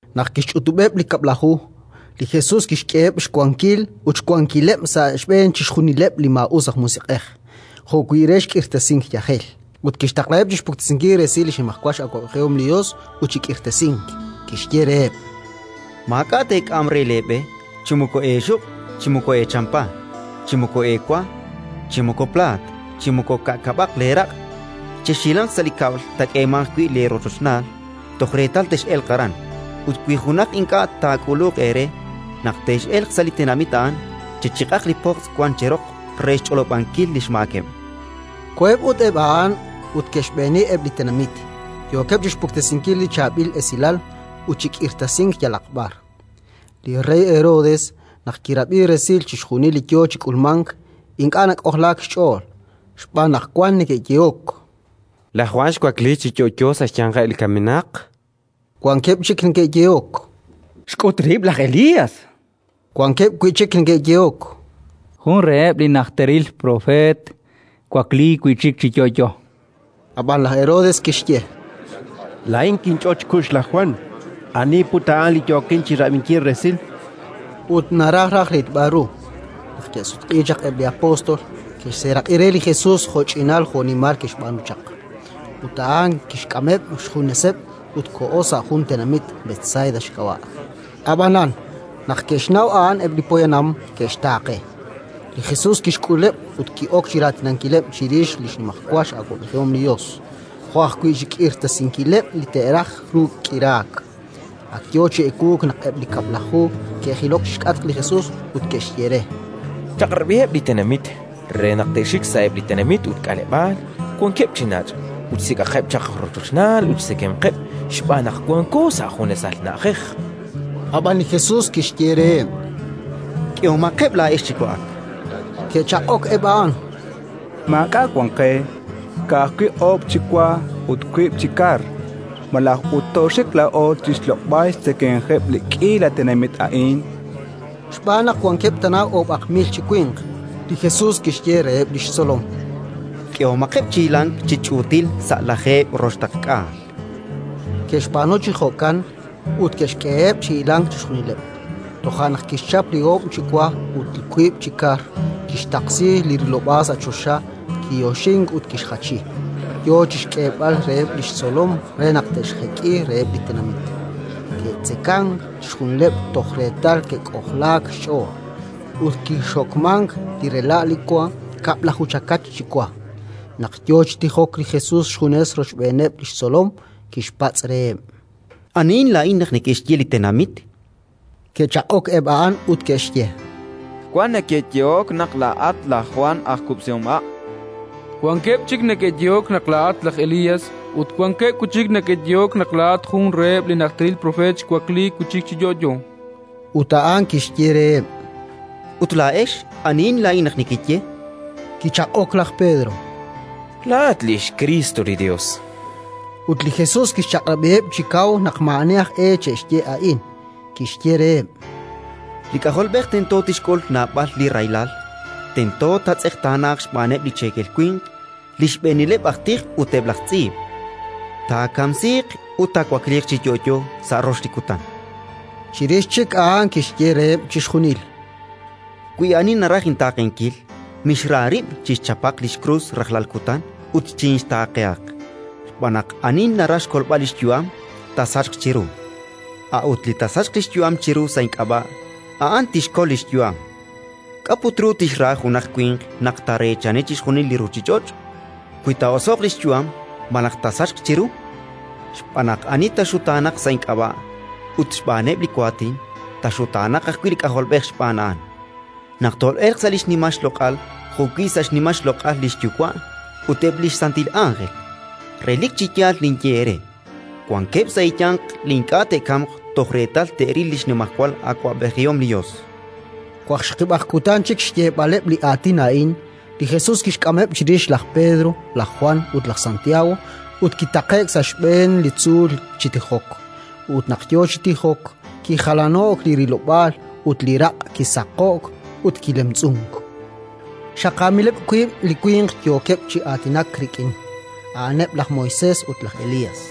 Naq kixch'utub'eb' li Kab'laju, li Jesus kixk'eheb' xkawilal ut xwankileb' sa' xb'een chixjunileb' li maa'us aj musiq'ej, jo'wi' re k'irtasink yajel. Ut kixtaqlaheb' chi xpuktesinkil resil li xnimajwal awab'ejihom li Yos ut chi k'irtasink. Kixye reheb': —Maak'a' teek'am re leeb'e: chi moko eexuq', chi moko eechampa, chi moko eewa, chi moko plaat, chi moko ka'kab'aq leeraq'. Chexhilanq sa' li kab'l taak'eemanq wi' eerochochnaal, toj reetal tex'elq aran. Ut wi junaq ink'a' taak'uluq eere, naq tex'elq sa' li tenamit a'an, chechiq'aq li pojtz' wank cheroq re xch'olob'ankil li xmaakeb'. Koheb' ut eb' a'an ut ke'xb'eeni eb' li tenamit, yookeb' chi xpuktesinkil li Chaab'il Esilal ut chi k'irtasink yalaq b'ar. Li rey Herodes naq kirab'i resil chixjunil li yo chi k'ulmank, ink'a' nak'ojlaak xch'ool, xb'aan naq wank neke'yehok: “Laj Jwan xwakliik chi yo'yo sa' xyanqeb' li kamenaq”. Wankeb' chik neke'yehok: “Xk'ut rib' laj Elías”. Wankeb' wi' chik neke'yehok: “Jun reheb' li najteril propeet xwakliik wi' chik chi yo'yo”. Ab'an laj Herodes kixye: —Laa'in kinch'ot xkux laj Jwan. Ani put a'an li yookin chi rab'inkil resil? Ut naraj raj rilb'al ru. Naq ke'sutq'iik chaq eb' li apóstol, ke'xseeraq'i re li Jesus jo'ch'inal jo'nimal ke'xb'aanu chaq. Ut a'an kixk'ameb' xjuneseb' ut koho sa' jun tenamit, Betsaida xk'ab'a'. Ab'anan, naq ke'xnaw a'an eb' li poyanam, ke'xtaaqe. Li Jesus kixk'uleb' ut ki'ok chi raatinankileb' chirix li xnimajwal awab'ejihom li Yos, jo' ajwi' chi xk'irtasinkileb' li te'raj ru k'iraak. Ak yo chi ewuuk naq eb' li Kab'laju ke'jilok chi xk'atq li Jesus ut ke'xye re: —Chaq'rab'iheb' li tenamit re naq te'xik sa'eb' li tenamit ut k'aleb'aal wankeb' chi nach' ut xsik'aqeb' chaq rochochnaal ut xtzekemqeb', xb'aan naq wanko sa' junesal na'ajej. Ab'an li Jesus kixye reheb': —K'ehomaqeb' laa'ex chi wa'ak. Ke'chaq'ok eb' a'an: —Maak'a' wank qe, ka'ajwi' oob' chi wa ut wiib' chi kar. Malaj ut tooxik laa'o chi xloq'b'al xtzekemqeb' li k'iila tenamit a'in? chankeb'. Xb'aan naq wankeb' tana oob'aq mil chi winq. Li Jesus kixye reheb' li xtzolom: —K'ehomaqeb' chi hilank chi ch'uutil sa' lajeeb' roxtaqk'aal. Ke'xb'aanu chi jo'kan ut ke'xk'eheb' chi hilank chixjunileb'. Toja' naq kixchap li oob' chi wa ut li wiib' chi kar, kixtaqsi li rilob'aal sa' choxa, kiyoxink ut kixjachi, yo chi xk'eeb'al reheb' li xtzolom re naq te'xjek'i reheb' li tenamit. Ke'tzekank chixjunileb' toj reetal ke'k'ojlaak xch'ool. Ut kixokmank li rela' li wa: kab'laju chakach chi wa. Naq yo chi tijok li Jesus xjunes rochb'eeneb' li xtzolom, kixpatz' reheb': —Anihin laa'in naq neke'xye li tenamit? Ke'chaq'ok eb' a'an ut ke'xye: —Wan neke'yehok naq laa'at laj Jwan aj kub'sihomha'. Wankeb' chik neke'yehok naq laa'at laj Elías, ut wankeb' wi' chik neke'yehok naq laa'at jun reheb' li najteril propeet xwakliik wi' chik chi yo'yo. Ut a'an kixye reheb': —Ut laa'ex, anihin laa'in naq nekeye? Kichaq'ok laj Pedro: —Laa'at li xKriist li Yos, chan. Ut li Jesus kixchaq'rab'iheb' chi kaw naq maa'ani aj e che'xye a'in. Kixye reheb': —Li K'ajolb'ej tento tixk'ul naab'al li rahilal, tento taatz'eqtaanaaq xb'aaneb' li cheekel winq, li xb'eenileb' aj tij ut eb' laj tz'iib'; taakamsiiq ut taawakliiq chi yo'yo sa' rox li kutan. Chirix chik a'an kixye reheb' chixjunil: —Wi ani naraj intaaqenkil, mixra rib', chixchapaq li xkrus rajlal kutan ut chinxtaaqehaq. Xb'aan naq ani naraj xkolb'al li xyu'am, taasachq chiru; a'ut li taasachq li xyu'am chiru sa' ink'ab'a', a'an tixkol li xyu'am. K'a' put ru tixra junaq winq naq taareechani chixjunil li ruuchich'och', wi taa'oso'q li xyu'am malaj taasachq chiru? Xb'aan naq ani taaxutaanaq sa' ink'ab'a' ut xb'aaneb' li waatin, taaxutaanaq ajwi' li K'ajolb'ej xb'aan a'an, naq tol'elq sa' li xnimal xloq'al jo'wi' sa' xnimal xloq'al li xYuwa' ut eb' li xsantil ánjel. Relik chi yaal ninye eere: wankeb' sa' eeyanq li ink'a' te'kamq toj reetal te'ril li xnimajwal awab'ejihom li Yos. Waqxaqib' kutan chik xyeeb'aleb' li aatin a'in, li Jesus kixk'ameb' chirix laj Pedro, laj Jwan ut laj Santiago, ut kitaqe'k sa' xb'een li tzuul chi tijok. Ut naq yo chi tijok, kijalano'k li rilob'aal ut li raq' kisaqo'k ut kilemtz'unk. Xaqaamileb' wiib' li winq yookeb' chi aatinak rik'in, a'aneb' laj Moisés ut laj Elías.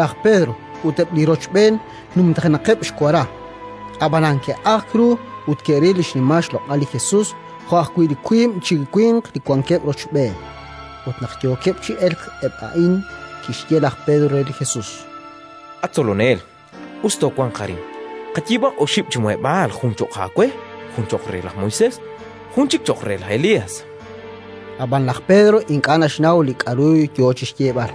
Laj Pedro ut eb' li rochb'een numtajenaqeb' xwara, ab'anan ke'ajk ru ut ke'ril li xnimal xloq'al li Jesus jo' ajwi' li wiib' chi winq li wankeb' rochb'een. Ut naq yookeb' chi elk eb' a'in, kixye laj Pedro re li Jesus: —At Tzolonel, us toowanq arin. Qayiib'aq oxib' chi muheb'aal: jun cho'q aawe, jun cho'q re laj Moisés, jun chik cho'q re laj Elías. Ab'an laj Pedro ink'a' naxnaw li k'aru yo chi xyeeb'al.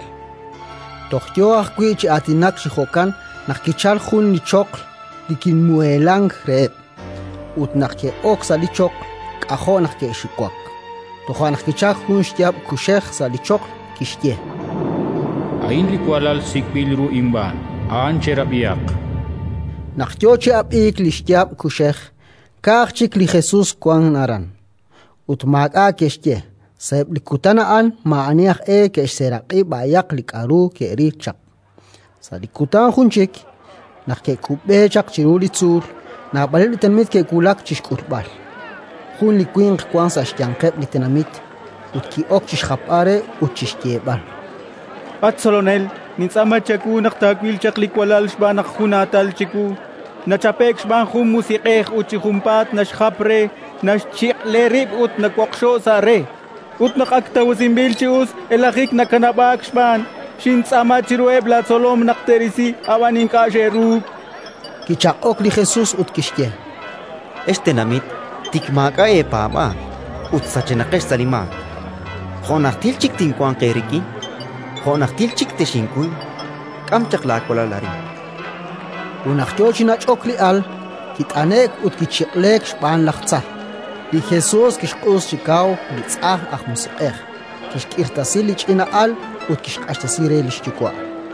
Toj yo ajwi' chi aatinak chi jo'kan, naq kichalk jun li choql li kimuheelank reheb'; ut naq ke'ok sa' li choql, k'ajo' naq ke'xiwak. Toja' naq kichalk jun xyaab' kuxej sa' li choql, kixye: “A'in li walal sik'b'il ru inb'aan. A'an cherab'ihaq”. Naq yo chi ab'iik li xyaab' kuxej, ka'aj chik li Jesus wank aran. Ut maak'a' ke'xye; sa'eb' li kutan a'an maa'ani aj e ke'xseeraq'i b'ayaq li k'aru ke'ril chaq. Sa' li kutan jun chik, naq ke'kub'e chaq chiru li tzuul, naab'aleb' li tenamit ke'wulak chi xk'ulb'al. Jun li winq wank sa' xyanqeb' li tenamit; ut ki'ok chi xjapb'al re ut chi xyeeb'al: —At Tzolonel, nintz'aama chawu naq taawil chaq li walal xb'aan naq junaatal chiwu. Nachape'k xb'aan jun musiq'ej ut chi junpaat naxjap re, naxchiq'le rib' ut nawoqxo'k sa' re. Ut naq ak tawasinb'il chi us, elajik nakanab'aak xb'aan. Xintz'aama chiruheb' laatzolom naq te'risi, ab'an ink'a' xe'ruuk. Kichaq'ok li Jesus ut kixye: —Ex tenamit tik maak'a' eepaab'aal ut sachenaqex sa' li maak, jo' najtil chik tinwanq eerik'in? Jo' najtil chik texinkuy? K'am chaq laawalal arin. Ut naq yo chi nach'ok li al, kit'ane'k ut kichiq'leek xb'aan laj tza. Li Jesus kixq'us chi kaw li tz'ajn aj musiq'ej, kixk'irtasi li ch'ina'al ut kixq'axtesi re li xyuwa'.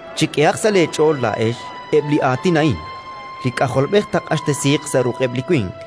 —Chek'ehaq sa' leech'ool laa'ex eb' li aatin a'in: li K'ajolb'ej taaq'axtesiiq sa' ruq'eb' li winq.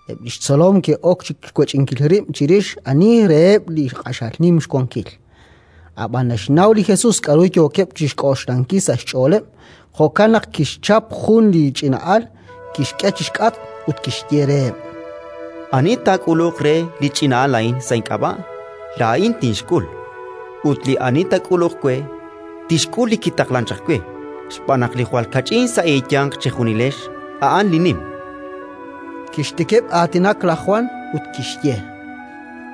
Eb' li xtzolom ke'ok chi xwech'inkileb' rib' chirix ani reheb' li q'axal nim xwankil. Ab'an naxnaw li Jesus k'aru yookeb' chi xk'oxlankil sa' xch'ooleb'; jo'kan naq kixchap jun li ch'ina'al, kixk'e chi xk'atq ut kixye reheb': —Ani taak'uluq re li ch'ina'al a'in sa' ink'ab'a', laa'in tinxk'ul; ut li ani taak'uluq we, tixk'ul li kitaqlank chaq we, xb'aan naq li jwal kach'in sa' eeyanq chejunilex, a'an li nim. Kixtikib' aatinak laj Jwan, ut kixye: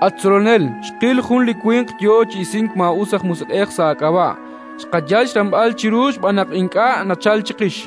—At Tzolonel, xqil jun li winq yo chi isink maa'us aj musiq'ej sa' aak'ab'a'. Xqayal xramb'al chiru xb'aan naq ink'a' nachalk chiqix.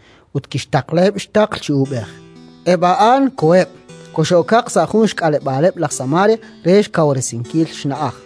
ut kixtaqlaheb' xtaql chi uub'ej. Eb' a'an koheb', koxe'okaq sa' jun xk'aleb'aaleb' laj Samaria re xkawresinkil xna'aj.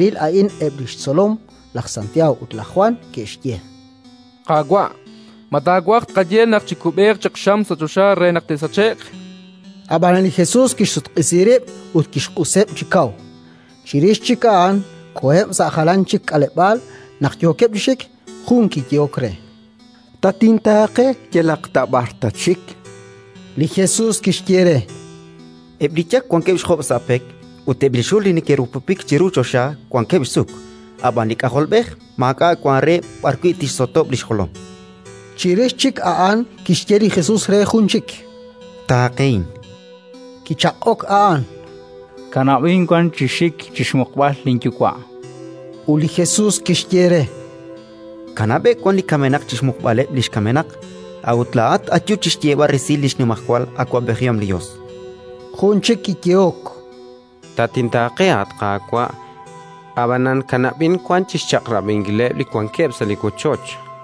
Naq ke'ril a'in eb' li xtzolom, laj Santiago ut laj Jwan, ke'xye: —Qaawa', ma taawaj tqaye naq chikub'eeq chaq xam sa' choxa re naq te'sache'q? Ab'an li Jesus kixsutq'isi rib' ut kixq'useb' chi kaw. Chirix chik a'an koheb' sa' jalan chik k'aleb'aal. Naq yookeb' chi xik, jun kiyehok re: —Tatintaaqe yalaq ta b'ar tatxik. Li Jesus kixye re: —Eb' li yak wankeb' xjob' sa' pek ut eb' li xul li neke'rupupik chiru choxa wankeb' xsuk, ab'an li K'ajolb'ej maak'a' wank re b'arwi' tixsotob' li xjolom. Chirix chik a'an kixye li Jesus re jun chik: —Taaqehin. Kichaq'ok a'an: —Kanab'in wan chi xik chi xmuqb'al linyuwa', chan. Ut li Jesus kixye re: —Kanab'eb' li kamenaq chi xmuqb'aleb' li xkamenaq. A'ut laa'at ayu chi xyeeb'al resil li xnimajwal awab'ejihom li Yos. Jun chik kiyehok: —Tatintaaqe, at Qaawa'; ab'anan kanab'in wan chi xchaq'rab'inkileb' li wankeb' sa' li wochoch.